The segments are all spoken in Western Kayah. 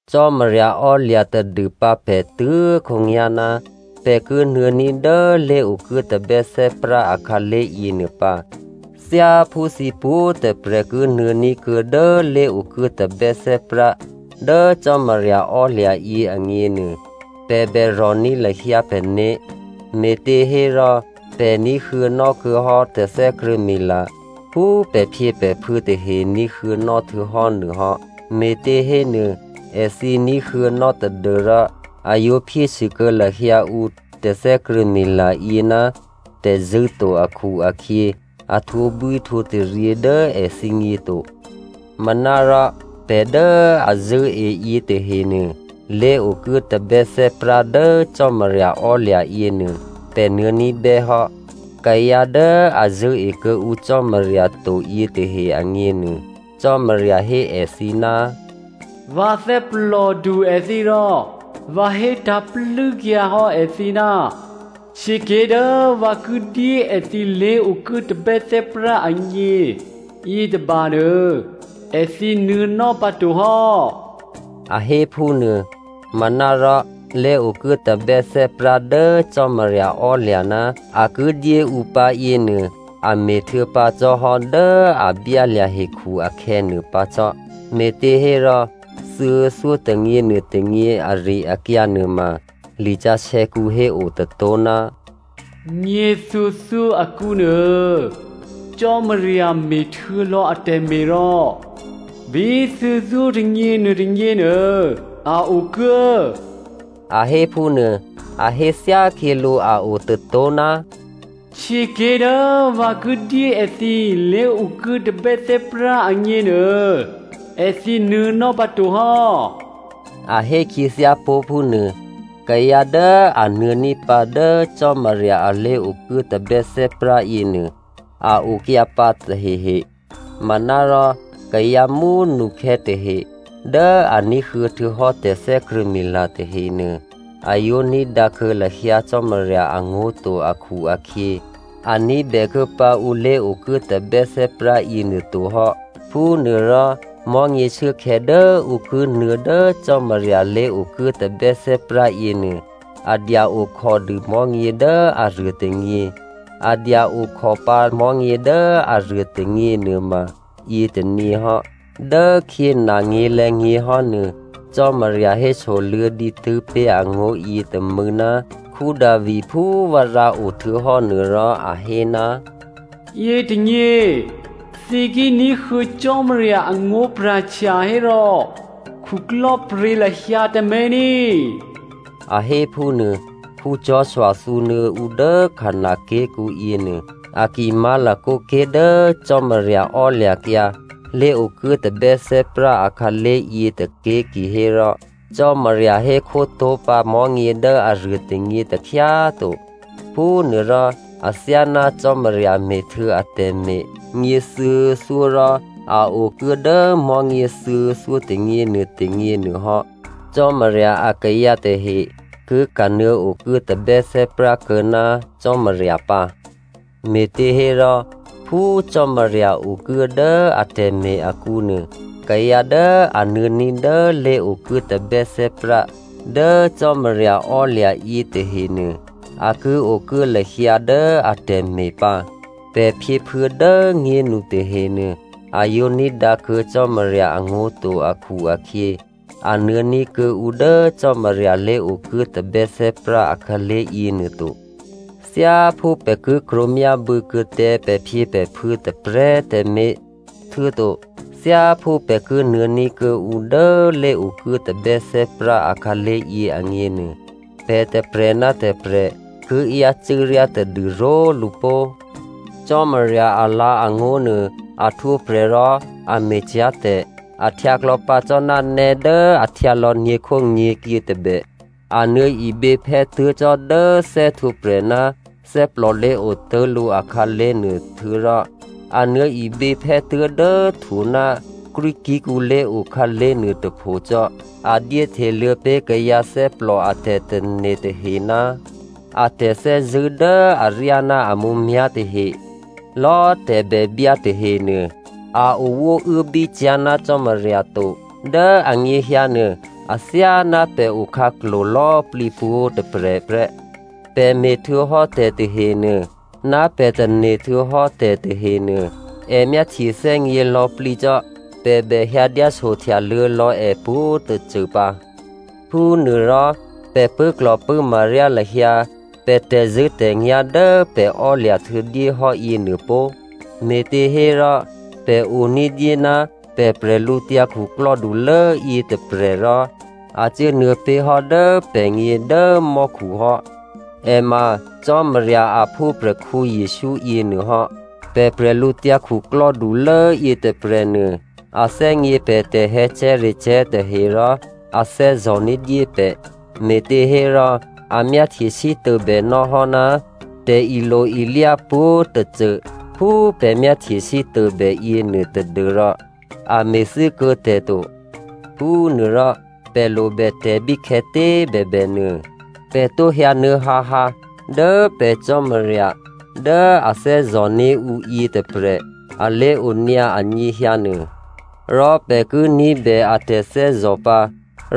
Cò́marya ò́lya̤ tadûpǎ pè̤ tuố̤khǒnyá̤ ná pè̤ ki nuô̌ní̤ dố lé̤okuố tabè́thè́prá akhǎlé̤ yěnuô pǎ. Thyáphú thǐ pwǒ̤꤮ tôprè̤ ki nuô̌ní̤ kuô̌ dố lé̤okuố tabè́thè́prá dố Cò́marya ò́lya̤ yě agněnuô, pè̤ bèrò̤ní̤ lahyǎ pè̤né̤. Me̤těhérò pè̤ ní̤huô̌nò́ kuô̌hò́ tè̤thè́krṳ̂̌mila phú pè̤phyěpè̤phuô̌ tahe ní̤huô̌nò́ htuô̌hò́ nuôhò́. Me̤tě hénuô èthǐ ní̤huô̌nò́ tadû́rò, a yǒ phyésû kuô̌ lahyǎ ǔ tè̤thè́krṳ̂̌mila yě ná tè̤zṳ̂́ to akhu-akhyě, a htwǒbwíhtwǒtaryě dố èthǐgně to. Manárò pè̤ dố a zṳ̂́e yětahenuô, lé̤okuố tabè́thè́prá dố Cò́marya ò́lya̤ yěnuô pè̤ nuô̌ní̤bè́ hò́. Kayǎ dố a zṳ̂́e kuô̌ǔ Cò́marya to yětahe agněnuô, Cò́marya hé èthǐ, “Vǎ thè́plòdu èthǐ rò vǎ hétǎ̤ plû́kyǎ hò́ èthǐ, ‘Htyěké̤ dố vǎ ki dyé èthǐ lé̤okuố tabè́thè́prá agně yětôba nuô, èthǐ nuô̌nò́ pǎto hò́,’” a hé phúnuô. Manárò lé̤okuố tabè́thè́prá dố Cò́marya ò́lya̤ ná a ki dyé ǔ pǎ yěnuô, a me̤ htuô̌pǎ cò́hò́ dố a byálya̤ hekhu akhè̌ nuôpǎ cò́. Me̤těhérò thuô̌thyótônyě nuôtônyě ari-akyǎ nuôma lisǎsè̌kǔ héo tôtó̤, “Nyěthuô̌thyó akǔnuô Cò́marya me̤htuô̌ lò̌ atè̤me̤ rò bí thuô̌thyótônyě nuôtônyěnuô a okuố,” a hé phúnuô. A hé thyákhyělǔ a o tôtó̤, “Htyěké̤ dố vǎ ki dyé èthǐ lé̤okuố tabè́thè́prá agněnuô, èthǐ nuô̌nò́ pǎtohò́” a hé khyěthyápó̤ phúnuô. Kayǎ dố a nuô̌ní̤pǎ dố Cò́marya a lé̤okuố tabè́thè́prá yěnuô, a okyǎpǎ tahehe. Manárò kayǎ mú꤮ nukhè̌ tahe dố a ní̤huô̌ htuô̌hò́ tè̤thè́krṳ̂̌mila tahenuô, a yǒ ní̤dǎkuô̌ lahyǎ Cò́marya angó̤ to akhu-akhyě, a ní̤bè kuô̌pǎ ǔ lé̤okuố tabè́thè́prá yěnuô to hò́. Phúnuôrò mò̤́nyě shuốkhè̌ dố ǔ ki nuô̌ dố Cò́marya lé̤okuố tabè́thè́prá yěnuô, a dya okhòdû mò̤́nyě dố aruô tônyě. A dya okhòpǎ mò̤́nyě dố aruô tônyě nuôma yětônyě hò́. Dốkhyě nanyě̤lè̌nyě̤hò́ nuô, Cò́marya hésoluô̌ dǐtû́ pé̤ angó̤yě tômû̌ ná Davi phú vǎ rǎo htuô̌hò́ nuô rò a hé, “Yětônyě thǐ ki ní̤huô̌ Cò́marya angó̤pra̤htya hérò khuklò́pryě̤ lahyǎ tǎmé̤ ní꤮” a hé phúnuô. Joshua thǔnuô̌ ǔ dố Canan ké̤kǔ yěnuô, a ki má̤lakǒ ké̤ dố Cò́marya ò́lya̤kyǎ lé̤okuố tabè́thè́prá akhǎlé̤ yě tôké̤ kihérò, Cò́marya hékhó tó̤pǎ mò̤́nyě dố aruô tônyě takhyá꤮ to. Phúnuôrò, athyáná Cò́marya me̤htuô̌ atè̤me̤ nyěthuô̌thyó rò a okuố dố mò̤́nyě thuô̌thyótônyě nuôtônyě nuôhò́, Cò́marya akayǎ tahe ki kanuô̌ okuố tabè́thè́prá kuô̌ ná Cò́marya pǎ. Me̤těhérò, phú Cò́marya okuố dố atè̤me̤ akǔnuô, kayǎ dố a nuô̌ní̤ dố lé̤okuố tabè́thè́prá dố Cò́marya ò́lya̤ yětahenuô, a ki okuố lahyǎ dố atè̤me̤ pǎ. Pè̤ phyěphuô̌ dố꤮ nyénu tahenuô, a yǒ ní̤dǎkuô̌ Cò́marya angó̤ to akhu-akhyě, a nuô̌ní̤ kuô̌ǔ dố Cò́marya lé̤okuố tabè́thè́prá akhǎlé̤ yěnuô to. Thyáphú pè̤ ki krwǒmyábû̌ kuô̌ tǎ pè̤phyěpè̤phuô̌ tôprè̤꤮ tǎmé̤, htuô̌to thyáphú pè̤ ki nuô̌ní̤ kuô̌ǔ dố lé̤okuố tabè́thè́prá akhǎlé̤ yě agněnuô, pè̤ tôprè̤ ná tôprè̤ ki yácû́ ryá tadû ró̤lǔ pó꤮. Cò́marya alǎ̤angó̤ nuô, a htwǒprè̤ rò a me̤cyá̤ tè̤. A htyǎ klò̌pǎ cò́ ná nè́ dố a htyǎlò̌ nyě̤khónyě̤kyě tôbè. A nuô̌ iběphè́ tuố̤ cò́ dố thè́htwǒprè̤ ná thè́plò lé̤o tố̤lǔ akhǎlé̤ nuô, htuô̌rò a nuô̌ iběphè́ tuố̤dố htwo ná krwíkí̤kǔ lé̤o khǎlé̤ nuôtôpho cò́. A dyéhteluô̌ pé̤ kayǎ thè́plò a tè̤tane̤ tahe ná a tè̤thè́zṳ̂́ dố aryá ná a mǔmyá̤ tahe. Lò̌ tè̤bèbyá tahenuô, a owóuốbí cyá̤ ná Cò́marya to. Dố anyěhyǎnuô, athyáná pè̤ okhǎklo̤ lò̌plǐ pwǒ̤꤮ tôprè̤ prè́. Pè̤ me̤htuô̌hò́ tè̤tahenuô, ná pè̤ tane̤ htuô̌hò́ tè̤tahenuô, è myáhtye thè́gně lò̌꤮ plǐ cò́. Pè̤ bè hyǎ dyáso htyaluô̌ lò̌ è pwǒ̤꤮ tôcô pǎ. Phúnuôrò, pè̤ pṳ̂́klò̤pṳ̂́ma ryá lahyǎ pè̤ tè̤zṳ̂́tè̤nyá̤ dố pè̤ ò́lya̤ htuô̌dyéhò́ yěnuô pó꤮, me̤těhérò, pè̤ o ní̤dyé ná pè̤ bwídukhulố yětôprè̤, rò a cuốnuô̌ pé̤hò́ dố pè̤gně dố mò́khu hò́. È ma Cò́marya a phúprè̤khǔ Jesǔ yěnuôhò́. Pè̤ bwídukhulố yětôprè̤nuô, a thè́gně pè̤ tè̤hè̌cè̤́recè̤́ tahe rò a thè́zò̤ ní̤dyé pè̤. Me̤těhérò a myáhtye sítôbè nò́hò́ ná tè̤ilo-ilyá pwǒ̤꤮ tôcô phú pè̤ myáhtye sítôbè yěnuô tadû́rò a me̤thû́kuô̌ tè̤ to. Phúnuôrò, pè̤ lobè tè̤ bíkhè̌tě꤮ bèbènuô, pè̤ tǒ hyǎnuô̌ hǎhǎ dố pè̤ Cò́marya dố a thè́zò̤ní̤ ǔ yětôprè̤ a lé̤onyǎ anyěhyǎ nuô. Rò pè̤ ki ní̤bè a tè̤thè́zò̤ pǎ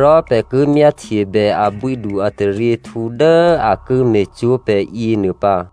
rò pè̤ ki myáhtyebè abwídu-ataryěhtǔ dố a ki me̤cwó̤ pè̤ yěnuô pǎ.